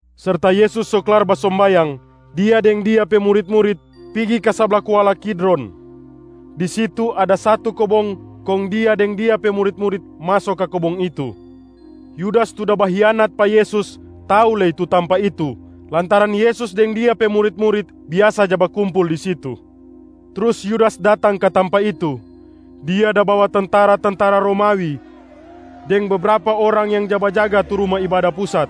Serta Yesus so klar basombayang, Dia deng Dia pe murit-murit pigi ka sabla kuala Kidron. Di situ ada satu kobong kong Dia deng Dia pe murit-murit maso ka kobong itu. Yudas tu da bahianat pa Yesus tau lei tu tampa itu lantaran Yesus deng Dia pe murit-murit biasa ja bakumpul di situ. Trus Yudas datang ka tampa itu. Dia da bawa tentara-tentara Romawi deng bebrapa orang yang ja bajaga tu Ruma Ibada Pusat.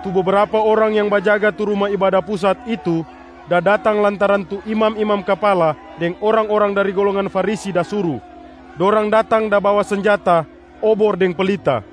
Tu bebrapa orang yang bajaga tu Ruma Ibada Pusat itu da datang lantaran tu imam-imam kapala deng orang-orang dari golongan Farisi da suru. Dorang datang da bawa senjata, obor deng pelita.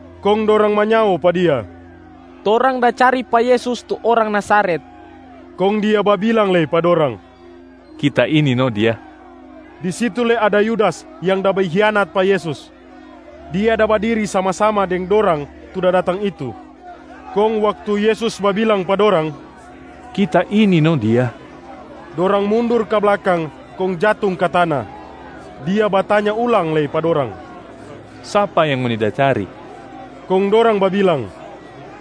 Kong dorang manyao pa Dia, “Torang da cari pa Yesus tu orang Nazaret.” Kong Dia babilang lei pa dorang, “Kita ini no Dia.” Di situ lei ada Yudas yang da bahianat pa Yesus, dia da badiri sama-sama deng dorang tu da datang itu. Kong waktu Yesus babilang pa dorang, “Kita ini no Dia,” dorang mundur ka blakang kong jatung ka tana. Dia batanya ulang lei pa dorang, “Sapa yang ngoni da cari?” Kong dorang babilang,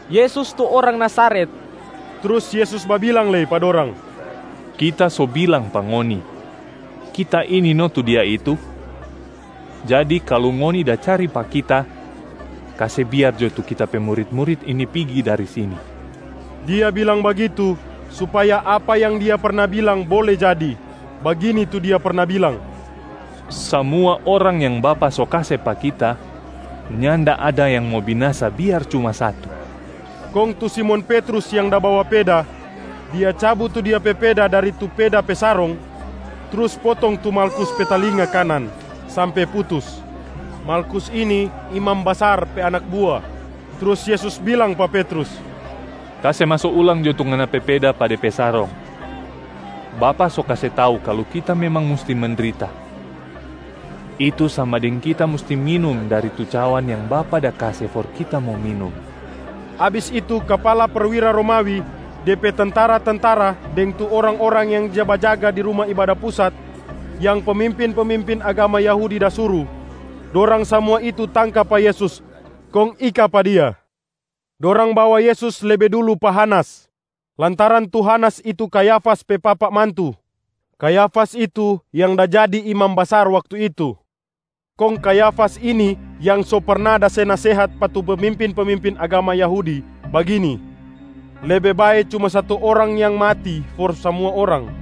“Yesus tu orang Nazaret.” Trus Yesus babilang lei pa dorang, “Kita so bilang pa ngoni, Kita ini no tu Dia itu. Jadi kalu ngoni da cari pa Kita, kase biar jo tu Kita pe murit-murit ini pigi dari sini.” Dia bilang bagitu, supaya apa yang Dia perna bilang bole jadi. Bagini tu Dia perna bilang, “Samua orang yang Bapa so kase pa Kita, nyanda ada yang mo binasa biar cuma satu.” Kong tu Simon Petrus yang da bawa peda, dia cabu tu dia pe peda dari tu peda pe sarong trus potong tu Malkus pe talinga kanan sampe putus. Malkus ini imam basar pe anak bua. Trus Yesus bilang pa Petrus, “Kase maso ulang jo tu ngana pe peda pa de pe sarong. Bapa so kase tau kalu Kita memang musti mendrita, itu sama deng Kita musti minum dari tu cawan yang Bapa da kase for Kita mo minum.” Abis itu kapala perwira Romawi, de pe tentara-tentara, deng tu orang-orang yang ja bajaga di Ruma Ibada Pusat yang pemimpin-pemimpin agama Yahudi da suru, dorang samua itu tangka pa Yesus kong ika pa Dia. Dorang bawa Yesus lebe dulu pa Hanas, lantaran tu Hanas itu Kayafas pe papa mantu. Kayafas itu yang da jadi imam basar waktu itu. Kong Kayafas ini yang so perna da se nasehat pa tu pemimpin-pemimpin agama Yahudi bagini, “Lebe bae cuma satu orang yang mati for samua orang.”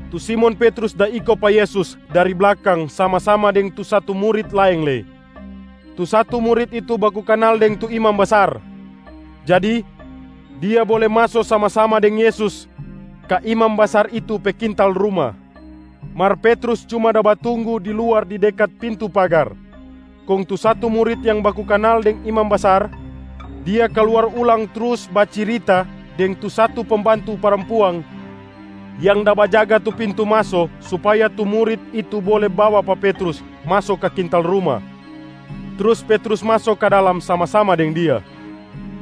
Tu Simon Petrus da iko pa Yesus dari blakang sama-sama deng tu satu murit laeng lei. Tu satu murit itu baku kanal deng tu imam basar, jadi dia bole maso sama-sama deng Yesus ka imam basar itu pe kintal ruma. Mar Petrus cuma da batunggu di luar di dekat pintu pagar. Kong tu satu murit yang baku kanal deng imam basar, dia kaluar ulang trus bacirita deng tu satu pembantu parampuang yang da bajaga tu pintu maso supaya tu murit itu bole bawa pa Petrus maso ka kintal ruma, trus Petrus maso ka dalam sama-sama deng dia.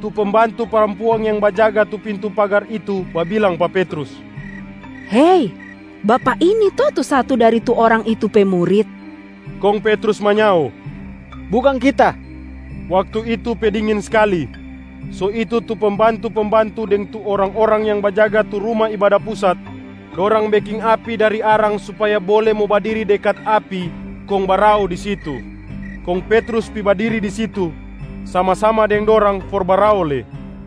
Tu pembantu parampuang yang bajaga tu pintu pagar itu babilang pa Petrus, “Hei, bapak ini to tu satu dari tu Orang itu pe murit?” Kong Petrus manyao, “Bukang kita.” Waktu itu pe dingin skali, so itu tu pembantu-pembantu deng tu orang-orang yang bajaga tu Ruma Ibada Pusat, dorang beking api dari arang supaya bole mo badiri dekat api kong barao di situ. Kong Petrus pi badiri di situ sama-sama deng dorang for barao lei.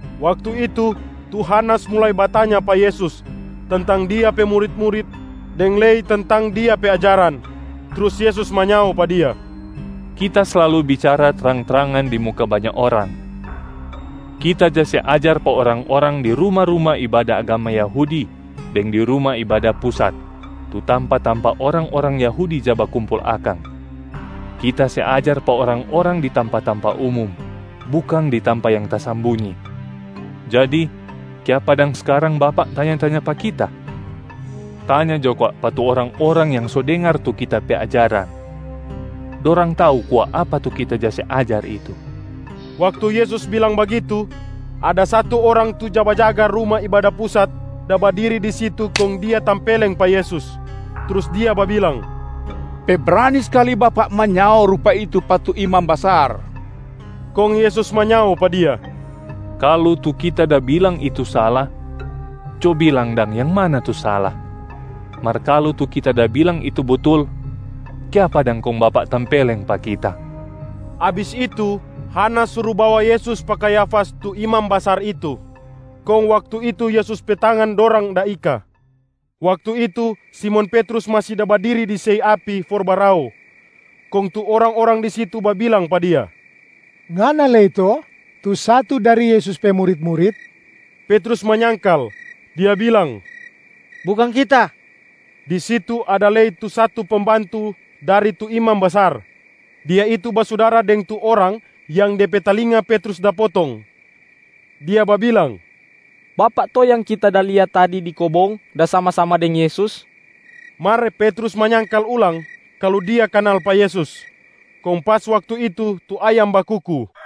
Waktu itu, tu Hanasa mulai batanya pa Yesus tentang Dia pe murit-murit deng lei tentang Dia pe ajaran. Trus Yesus manyao pa dia, “Kita slalu bicara trang-trangan di muka banya orang. Kita ja se ajar pa orang-orang di ruma-ruma ibada agama Yahudi deng di Ruma Ibada Pusat, tu tampa-tampa orang-orang Yahudi ja bakumpul akang. Kita se ajar pa orang-orang di tampa-tampa umum, bukang di tampa yang tasambunyi. Jadi kiapa dang skarang bapak tanya-tanya pa Kita? Tanya jo kwa pa tu orang-orang yang so dengar tu Kita pe ajaran, dorang tau kwa apa tu Kita ja se ajar itu.” Waktu Yesus bilang bagitu, ada satu orang tu ja bajaga Ruma Ibada Pusat da badiri di situ kong dia tampeleng pa Yesus, trus dia babilang, “Pe brani skali Bapak manyao rupa itu pa tu imam basar!” Kong Yesus manyao pa dia, “Kalu tu Kita da bilang itu sala, co bilang dang yang mana tu sala, mar kalu tu Kita da bilang itu butul, kiapa dang kong bapak tampeleng pa Kita?” Abis itu, Hanas suru bawa Yesus pa Kayafas tu imam basar itu, kong waktu itu Yesus pe tangan dorang da ika. Waktu itu, Simon Petrus masi da badiri di sei api for barao. Kong tu orang-orang di situ babilang pa dia, “Ngana lei to tu satu dari Yesus pe murit-murit?” Petrus manyangkal, dia bilang, “Bukang kita.” Di situ ada lei tu satu pembantu dari tu imam basar, dia itu basudara deng tu orang yang de pe talinga Petrus da potong. Dia babilang, “Bapak to yang kita da lia tadi di kobong da sama-sama deng Yesus?” Mar Petrus manyangkal ulang kalu dia kanal pa Yesus. Kong pas waktu itu tu ayam bakuku.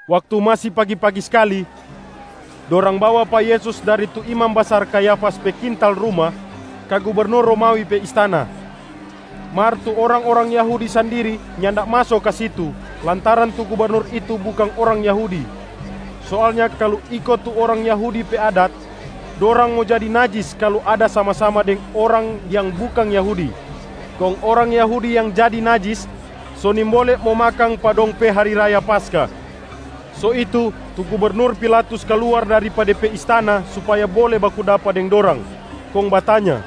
Waktu masi pagi-pagi skali, dorang bawa pa Yesus dari tu imam basar Kayafas pe kintal ruma ka gubernur Romawi pe istana. Mar tu orang-orang Yahudi sandiri nyanda maso ka situ lantaran tu gubernur itu bukang orang Yahudi. Soalnya kalu iko tu orang Yahudi pe adat, dorang mo jadi najis kalu ada sama-sama deng orang yang bukang Yahudi, kong orang Yahudi yang jadi najis so nimbole mo makang pa dong pe hari raya Paskah. So itu, tu gubernur Pilatus kaluar dari pa de pe istana supaya bole baku dapa deng dorang, kong batanya,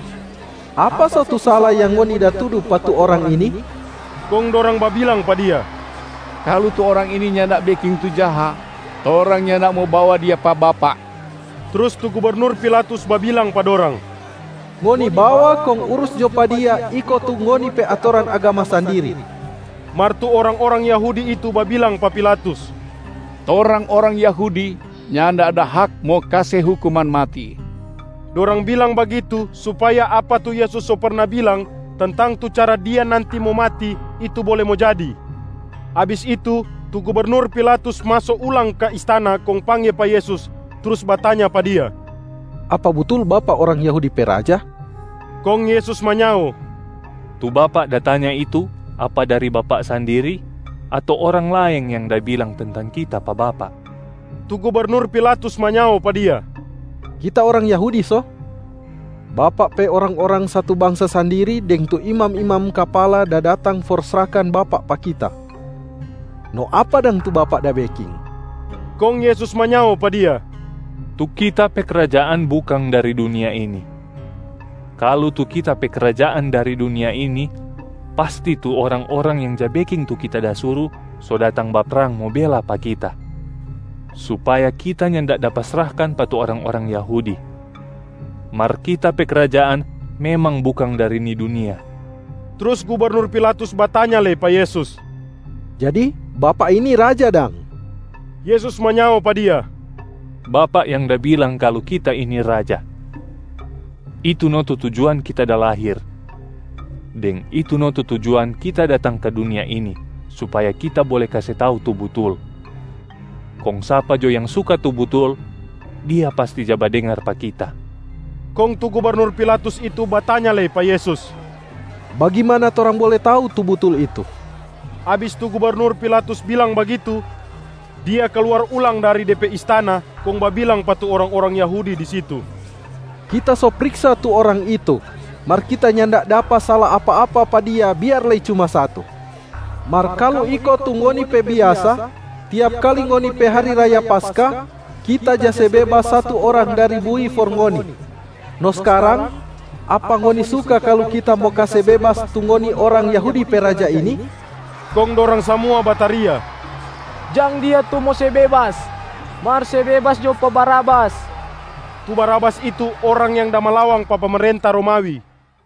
“Apa so tu sala yang ngoni da tudu pa tu Orang ini?” Kong dorang babilang pa dia, “Kalu tu Orang ini nyanda beking tu jaha, torang nyanda mo bawa Dia pa bapak.” Trus tu gubernur Pilatus babilang pa dorang, “Ngoni bawa kong urus jo pa Dia iko tu ngoni pe atoran agama sandiri.” Mar tu orang-orang Yahudi itu babilang pa Pilatus, “Torang orang Yahudi nyanda ada hak mo kase hukuman mati.” Dorang bilang bagitu supaya apa tu Yesus so perna bilang tentang tu cara Dia nanti mo mati itu bole mo jadi. Abis itu, tu gubernur Pilatus maso ulang ka istana kong pangge pa Yesus trus batanya pa Dia, “Apa butul Bapak orang Yahudi pe raja?” Kong Yesus manyao, “Tu bapak da tanya itu apa dari bapak sandiri, ato orang laeng yang da bilang tentang Kita pa bapak?” Tu gubernur Pilatus manyao pa Dia, “Kita orang Yahudi so? Bapak pe orang-orang satu bangsa sandiri deng tu imam-imam kapala da datang for srahkan Bapak pa kita. No apa dang tu Bapak da beking?” Kong Yesus manyao pa dia, “Tu Kita pe krajaan bukang dari dunia ini. Kalu tu Kita pe krajaan dari dunia ini, pasti tu orang-orang yang ja beking tu Kita da suru so datang baprang mo bela pa Kita, supaya Kita nyanda dapa srahkan pa tu orang-orang Yahudi. Mar Kita pe krajaan memang bukang dari ni dunia.” Trus gubernur Pilatus batanya lei pa Yesus, “Jadi Bapak ini Raja dang?” Yesus manyao pa dia, “Bapak yang da bilang kalu Kita ini Raja. Itu no tu tujuan Kita da lahir, deng itu no tu tujuan Kita datang ka dunia ini supaya Kita bole kase tau tu butul. Kong sapa jo yang suka tu butul, dia pasti ja badengar pa Kita.” Kong tu gubernur Pilatus itu batanya lei pa Yesus, “Bagimana torang bole tau tu butul itu?” Yesus dapa hukuman mati Abis tu gubernur Pilatus bilang bagitu, dia kaluar ulang dari pa de pe istana kong babilang pa tu orang-orang Yahudi di situ, “Kita so priksa tu Orang itu, mar kita nyanda dapa sala apa-apa pa Dia biar lei cuma satu. Mar kalu iko tu ngoni pe biasa, tiap kali ngoni pe hari raya Paskah, kita ja se bebas satu orang dari bui for ngoni. No skarang, apa ngoni suka kalu kita mo kase bebas tu ngoni orang Yahudi pe Raja ini?” Kong dorang samua bataria, “Jang Dia tu mo se bebas, mar se bebas jo pa Barabas!” Tu Barabas itu orang yang da malawang pa pemerenta Romawi.